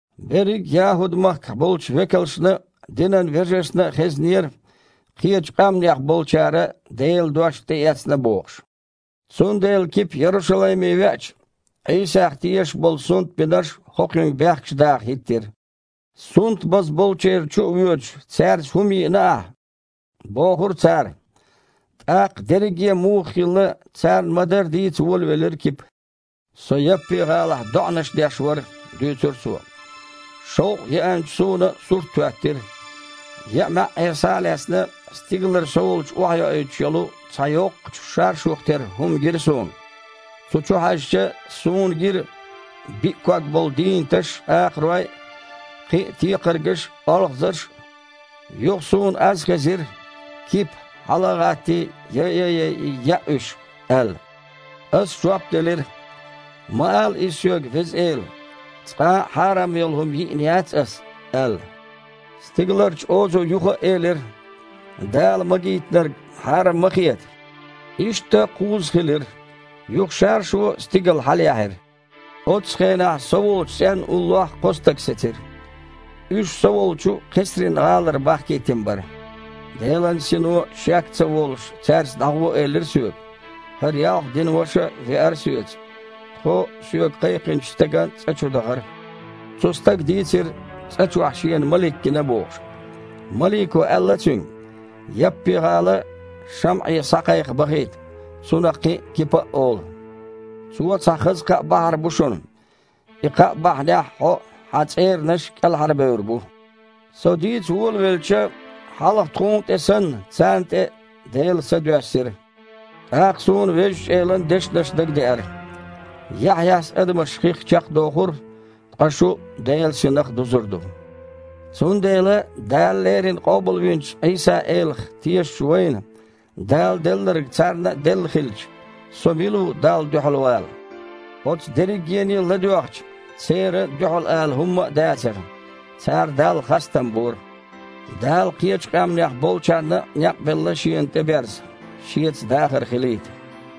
Берриг а ЯхІуд-махкахь болчу векалшна а, динан вежаршна а хезнера, кхечу къаьмнех болчара Делан дош тІеэцна бохуш. Цундела Кипа Ярушалайме веача, Іийсах тешаш болу сунтбинарш хІокхуьнга бехкаш даха хІиттира. «Сунтбаза болчеран чу а воьдуш, цаьрца хІума йиъна ахь», – бохура цара. ТІаккха дерриге а муха хилла, царна ма-дарра дийца волавелира Кипа. «Со Яппи-гІалахь доІанаш деш вара, – дуьйцура цо, – шовкъ еанчу суна сурт хІоьттира. Еа маьІІера схьа а лаьцна, стигалара со волчу охьайоуьйтуш йолу цхьа йоккхачу шаршух тера хІума гира суна. Цу чу хьаьжча, суна гира биъ ког болу дийнаташ а, акхарой а, кхин а текхаргаш а, олхазарш а. Юха суна аз хезира: „Кипа, хьала а гІаттий, яйа а яйий, яа уьш“, – аьлла. Ас жоп делира: „Ма ала иза соьга, Веза Эла! Цкъа а хьарам йолу хІума йиъна яц аса“, – аьлла. Стигаларчу озо юха а элира: „Дала магийтинарг хьарам ма хета“. Иштта кхузза хилира, юха шаршу стигала хьалаяьхьира. Оццу хенахь со волчу цІенна уллохь кхо стаг сецира. Уьш со волчу Кхесрин-гІалара бахкийтина бара. Делан Сино, шек а ца волуш, цаьрца дІагІо элира соьга. ХІара ялх динан ваша а веара соьца. Тхо соьга кхайкхинчу стеган цІа чу дахара. Цу стага дийцира, цІа чохь шена малик гина бохуш. Малико аьлла цуьнга: „Яппи-гІала ШамІе схьакхайкха бахийта. Цунах кхин Кипа а олу. Цо цхьа хаза кхаъ бахьар бу шуна. И кхаъ бахьанехь хьо а, хьан цІеранаш а кІелхьарбевр бу“. Со дийца волавелча, хьалха тхуна тІе санна, царна тІе а Делан Са доьссира. ТІаккха суна Везачу Элан дешнаш дагадеара: „Яхьъяс адамаш хих чекхдохура, ткъа шу Делан Синах дузур ду“. Цундела Дала леррина къобалвинчу Іийса-Элах тешачу вайна Дала делларг царна а делла хилча, со мила ву Далла дуьхьал вала?» Оцу дерригене а ладоьгІча, церан дуьхьал ала хІумма а дацара. Цара Далла хастам бора: «Дала кхечу къаьмнех болчарна а некъ белла Шена тІеберза, Шеца дахар хилийта».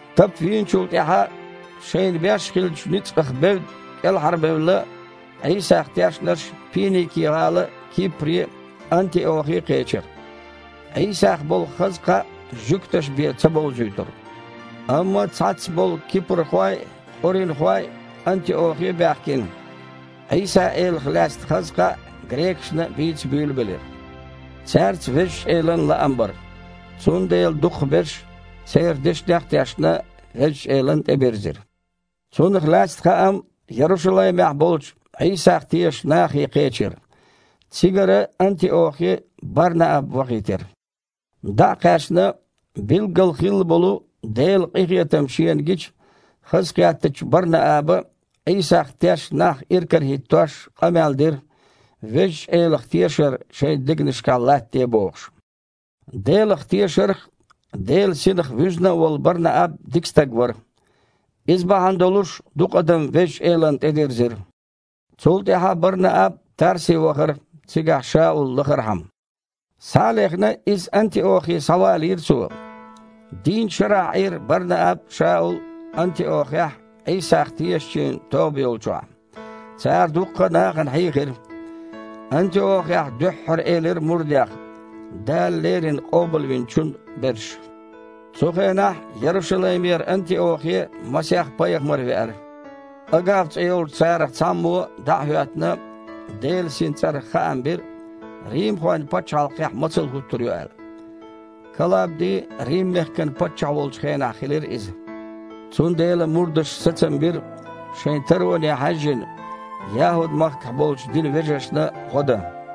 Тапа вийначул тІаьхьа шайна беш хиллачу ницкъах бевдда кІелхьарбевлла Іийсах тешнарш Пиники-гІала а, Кипре а, Антиохе а кхечира. Іийсах болу хаза кхаъ жуьгташна бен ца бовзуьйтура. Амма цхьацца болу кипрхой а, къуринхой а Антиохе а баьхкина, Іийса-Элах лаьцна хаза кхаъ грекашна а бийца буьйлабелира. Цаьрца Везачу Элан лаам бара, цундела дукхахберш церан дешнех а тешна, Везачу Элана тІебирзира. Цунах лаьцна хаам Ярушалаймехь болчу Іийсах тешачу нахе кхечира. Цигара Антиохе Бар-Нааб вахийтира. ДІа а кхаьчна, билггала хилла болу Делан къинхетам шена гича, хазахеттачу Бар-Нааба, Іийсах тешна нах иркарахІиттош, къамел дира, Везачу Элах тешар шайн дегнашкахь латтаде бохуш. Делах тешарх а, Делан Синах а вуьзна волу Бар-Нааб дика стаг вара. Иза бахьана долуш дукха адам Везачу Элана тІедирзира. Цул тІаьхьа Бар-Нааб Тарсе вахара, цигахь Шаул лахархьама. Схьа а лехна, иза Антиохе схьавалийра цо. Дийнна шарахь Іийра Бар-Нааб а, Шаул а Антиохехь Іийсах тешачийн тоба йолчохь. Цара дуккха а нахана хьийхира. Антиохехь дуьххьара элира мурдех «Дала леррина Къобалвинчун берш». Цу хенахь Ярушалаймера Антиохе масех пайхамар веара. Агав цІе йолчу царах цхьаммо, дІа а хІоьттина, Делан Синан цІарах хаам бира, римхойн пачхьалкхехь мацалла хІуттур ю аьлла. (Калабди Рим-мехкан паччахь волчу хенахь хилира иза.) Цундела мурдаша сацам бира, шайн тароне хьаьжжина, ЯхІуд-махкахь болчу динан вежаршна гІо дан.